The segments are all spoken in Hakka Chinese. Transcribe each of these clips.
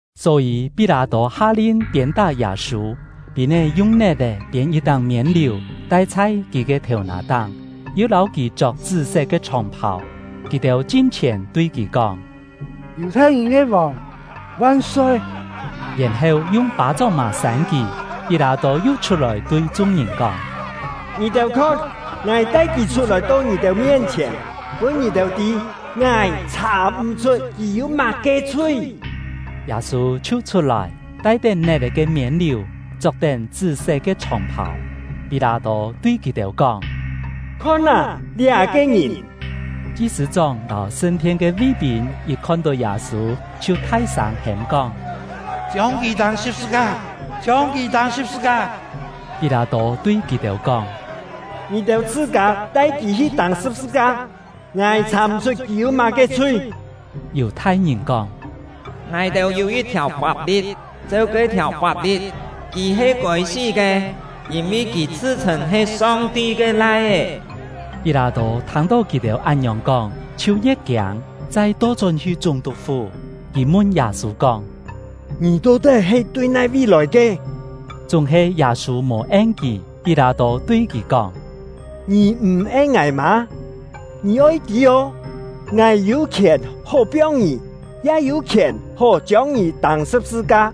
Só-yî, Pí-lâ-tô ha-lin piên-tá Yâ-sû. Pîn-é yung net-è phiên yit-táng miên-liù, tai chhai kì ke thèu-nà-táng, yu lâu kì chok chṳ́-set ke chhòng-phàu. Kì-têu chin-chhièn tui kì kóng: “Yù-thai-ngìn ke vòng van-soi!” Yèn-heu yung pâ-chóng-mà sân kì. Pí-lâ-tô yu chhut-lòi tui chung-ngìn kóng: “Ngì-têu khon, ngài tai kì chhut-lòi to ngì-têu mien-chhièn, pûn ngì-têu tî, ngài chhà-m̀-chhut kì yû má-ke chhui.” Yâ-sû chhiu chhut-lòi, tai-tén net-è ke miên-liù, chok-tén chṳ́-set ke chhòng-phàu. Pí-lâ-tô tui kì-têu kóng: “Khon â, liá-ke ngìn!” Chi-sṳ̂-chóng lâu sṳn-thien ke ví-pîn yit khon-tó Yâ-sû, chhiu thai-sâng hêm-kóng: “Chiông kì tâng sṳ̍p-sṳ-ka! Chiông kì tâng sṳ̍p-sṳ-ka!” Pí-lâ-tô tui kì-têu kóng: “Ngì-têu chhṳ-kâ tai kì hi tâng sṳ̍p-sṳ-ka. Ngài chhà-m̀-chhut kì yû má-ke chhui.” Yù-thai-ngìn kóng: “Ngài-têu yû yit-thiàu fap-li̍t, cheu ke-thiàu fap-li̍t, kì he kôi-sí ke, yîn-vi kì chhṳ-chhṳ̂n he Song-ti ke Lai-é.” Pí-lâ-tô thâng-tó kì-têu án-ngiòng kóng, chhiu ye̍t kiâng; chai to-chón-hi chúng-tuk-fú. Kì mun Yâ-sû kóng: “Ngì to-tái he tui nai-vi lòi ke?” Chúng-he Yâ-sû mò en kì. Pí-lâ-tô tui kì kóng: “Ngì m̀ en ngài mâ? Ngì oi tî ô, ngài yû khièn hó piong ngì, ya yû khièn hó chiông ngì tâng sṳ̍p-sṳ-ka.”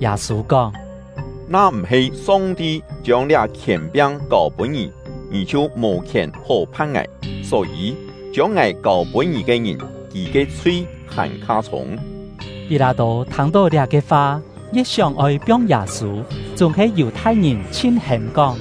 Yâ-sû kóng: “Na m̀-he Song-ti chiông liá khièn-piang kâu-pûn ngì, ngì chhiu mò khièn hó phan ngài. Só-yî, chiông ngài kâu-pûn ngì ke ngìn, kì ke chhui hàn-kha chhûng.” Pí-lâ-tô thâng-tó liá-ke fa, ye̍t sióng-oi piong Yâ-sû. Chúng-he Yù-thai-ngìn chhin-hêm kóng: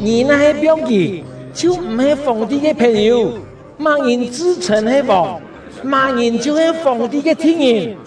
“Ngì na-he piong kì, chhiu m̀-he Fòng-ti ke phèn-yû! Má-ngìn chhṳ-chhṳ̂n he vòng, má-ngìn chhiu-he Fòng-ti ke thi̍t-ngìn.”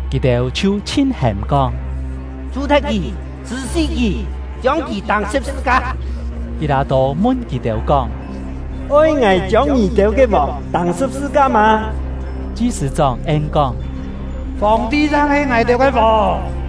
Kì-têu chhiu chhin-hêm kóng: “Chhù-thet kì! Chhṳ̀-sí kì! Chiông kì tâng sṳ̍p-sṳ-ka!” Pí-lâ-tô mun kì-têu kóng: “Oi ngài chiông ngì-têu ke vòng tâng sṳ̍p-sṳ-ka mâ?” Chi-sṳ̂-chóng en-kóng: “Fòng-ti chang he ngài-têu ke vòng!”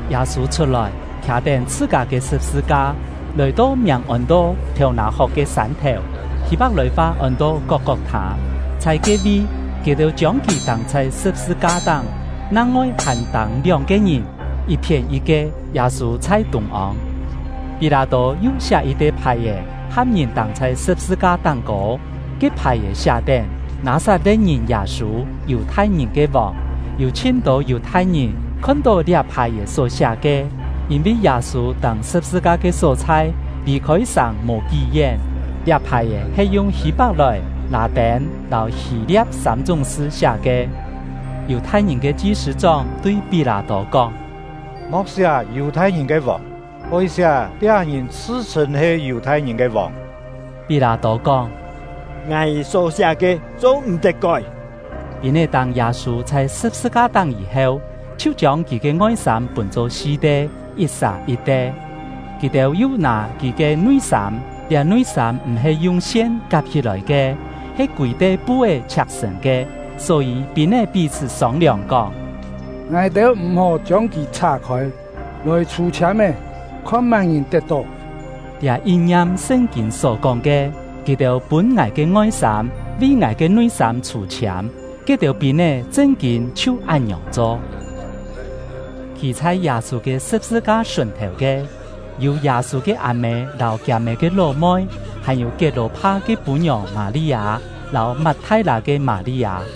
Yâ-sû chhut-lòi, khià-tén chhṳ-kâ ke sṳ̍p-sṳ-ka, lòi-to miàng ôn-to “Thèu-nà-hok ke Sân-thèu” (Hî-pak-lòi-fa ôn-to “Kok-kok-thâ”). Chhai ke-vi, kì-têu chiông kì tâng chhai sṳ̍p-sṳ-ka-táng; nang-ngoi hàn tâng lióng-ke ngìn, yit-phién yit-ke, Yâ-sû chhai tûng-ông. Pí-lâ-tô yu siá yit-te phài-è, ham ngìn tâng chhai sṳ̍p-sṳ-ka táng-kô. Ke phài-è siá-tén: “Nâ-sat-le̍t-ngìn Yâ-sû, Yù-thai-ngìn ke vòng.” Yû chhin-tô Yù-thai-ngìn khon-tó liá phài-è só siá ke, yîn-vi Yâ-sû tâng sṳ̍p-sṳ-ka ke só-chhai lì-khôi sàng mò kí-yén; liá phài-è he yung Hî-pak-lòi, Lâ-tên, lâu Hî-lia̍p sâm-chúng sṳ siá ke. Yù-thai-ngìn ke chi-sṳ̂-chóng tui Pí-lâ-tô kóng: “Mo̍k siá ‘Yù-thai-ngìn ke vòng’, oi siá ‘Liá ngìn chhṳ-chhṳ̂n he Yù-thai-ngìn ke vòng’.” Pí-lâ-tô kóng: “Ngài só siá ke, cho-m̀-tet kói!” Pîn-é tâng Yâ-sû chhai sṳ̍p-sṳ-ka-táng yî-heu, chhiu chiông kì ke ngoi-sâm pûn-cho si-te, yit-sà yit-te. Kì-têu yu nâ kì ke nui-sâm; liá nui-sâm m̀-he yung sien kap-hí-lòi ke, he kûi-te pu-é chhiak-sṳ̀n ke. Só-yî, pîn-é pí-chhṳ́ sông-liòng kóng: “Ngài-têu m̀-hó chiông kì chhá-khôi; lòi chhû-chhiâm-é, khon má-ngìn tet-tó.” Liá yin-ngiam Sṳn-kîn só-kóng ke: Kì-têu pûn ngài ke ngoi-sâm, vi ngài ke nui-sâm chhû-chhiâm. Ke-têu pîn-é chṳn-kîn chhiu án-ngiòng cho. Khî chhai Yâ-sû ke sṳ̍p-sṳ-ka sùn-thèu ke, yû Yâ-sû ke â-mê lâu kiâ-mê ke ló-moi, hàn-yû Kiet-lò-pha ke pû-ngiòng Mâ-li-â, lâu Mat-thai-lâ ke Mâ-li-â.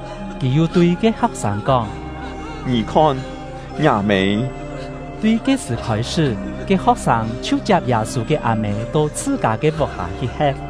Kì yu tui ke ho̍k-sâng kóng: “Ngì khon, ngiâ mê.” Tui ke-sṳ̀ khôi-sṳ́, ke ho̍k-sâng chhiu chiap Yâ-sû ke â-mê to chhṳ-kâ ke vuk-hâ hi he̍t.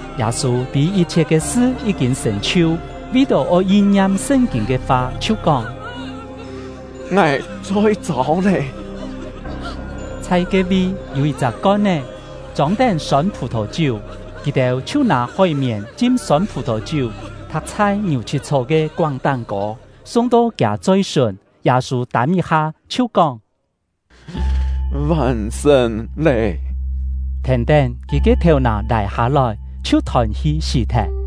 Yâ-sû tî yit-chhiet ke sṳ yí-kîn sṳ̀n-chhiu, vi-tó oi yin-ngiam Sṳn-kîn ke fa, chhiu kóng: “Ngài choi-châu lé.” Chhai ke-vi, yû yit-chak kon-é, chông-tén sôn phù-thò-chiú; kì-têu chhiu nâ hói-mièn chim sôn phù-thò-chiú, thak chhai ngiù-chhit-chhó ke koáng táng-kô, sung-to kiâ choi-sùn. Yâ-sû tâm yit-ha, chhiu kóng: “Vàn-sṳ̀n lé!” Thèn-tén, kì ke thèu-nà lài-hâ-lòi, chhiu thôn-hi sí-thet.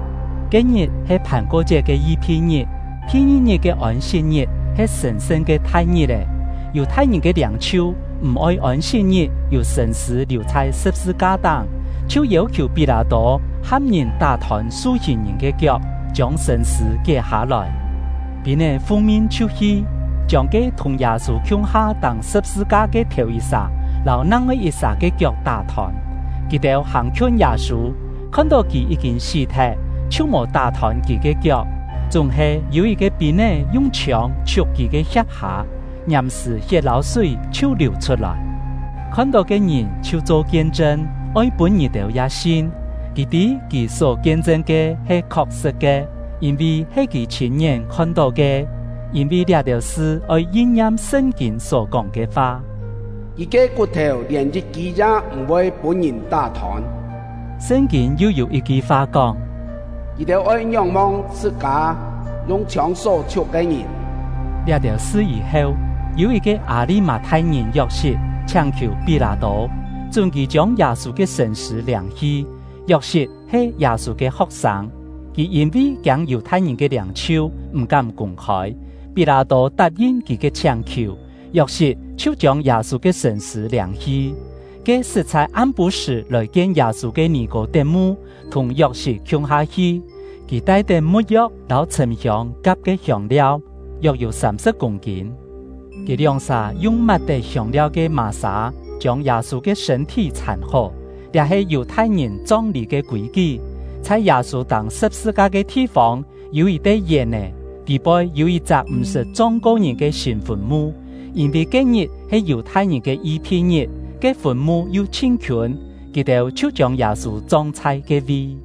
Ke-ngit he Phàn-ko-chiet ke Yi-phi-ngit, thi-ngi-ngit ke Ôn-sit-ngit he sṳ̀n-sṳn ke thai ngit-è. Yù-thai-ngìn ke liâng-chhiu m̀-oi Ôn-sit-ngit yû sṳ̂n-sṳ̂ liù chhai sṳ̍p-sṳ-ka-táng, chhiu yêu-khiù Pí-lâ-tô ham ngìn tá-thôn su-hìn ngìn ke kiok, chiông sṳ̂n-sṳ̂ kié hâ-lòi. Pîn-é fung-min chhiu hi, chiông ke thùng Yâ-sû khiung-ha tâng sṳ̍p-sṳ-ka ke thèu-yit-sà lâu nang-ngoi yit-sà ke kiok tá-thôn. Kì-têu hàng-khiûn Yâ-sû, khon-tó kì yí-kîn sí-thet, chhiu mò tá-thôn kì ke kiok. Chúng-he, yû yit-ke pîn-é yung chhiông chhiuk kì ke hia̍p-hâ, ngiàm-sṳ̀ hiet lâu súi chhiu liù chhut-lòi. (Khon-tó ke ngìn chhiu cho kien-chṳn, oi pûn ngì-têu ya sin. Kì tî kì só kien-chṳn ke he khok-sṳ̍t ke, yîn-vi he kì chhîn-ngién khon-tó ke.) Yîn-vi liá-têu sṳ oi yin-ngiam Sṳn-kîn só kóng ke fa: “Kì ke kut-thèu lièn yit-kî ya m̀-voi pûn-ngìn tá-thôn.” Sṳn-kîn yu yû yit-ki fa kóng: “Kì-têu oi ngióng-mong chhṳ-kâ yung chhiông só chhiuk ke ngìn.” Liá-têu sṳ yî-heu, yû yit-ke Â-li-mâ-thai-ngìn Yok-sit chhiáng-khiù Pí-lâ-tô, chún kì chiông Yâ-sû ke sṳ̂n-sṳ̂ liâng-hi. (Yok-sit he Yâ-sû ke ho̍k-sâng; kì yîn-vi kiâng Yù-thai-ngìn ke liâng-chhiu, m̀-kám kûng-khôi.) Pí-lâ-tô tap-yin kì ke chhiáng-khiù, Yok-sit chhiu chiông Yâ-sû ke sṳ̂n-sṳ̂ liâng-hi. Ke sṳt chhai am-pû-sṳ̀ lòi-kien Yâ-sû ke Nì-kô-tet-mu thùng Yok-sit khiung-ha hi. Kì tai-tén mu̍t-yo̍k lâu chhṳ̀m-hiông kap ke hiông-liau, yok-yû sâm-sṳ̍p kûng-kîn. Kì lióng-sà yung mat-tén hiông-liau ke mà-sâ chiông Yâ-sû ke sṳ̂n-thí chhàn-hó; liá he Yù-thai-ngìn chong-lî ke kûi-kí. Chhai Yâ-sû tâng sṳ̍p-sṳ-ka ke thi-fông yû yit-te yèn-è, tî-poi yû yit-chak m̀-sṳt chong-ko ngìn ke sîn fùn-mu. Yîn-vi ke-ngit he Yù-thai-ngìn ke Yi-phi-ngit, ke fùn-mu yu chhin khiûn, kì-têu chhiu chiông Yâ-sû chong chhai ke-vi.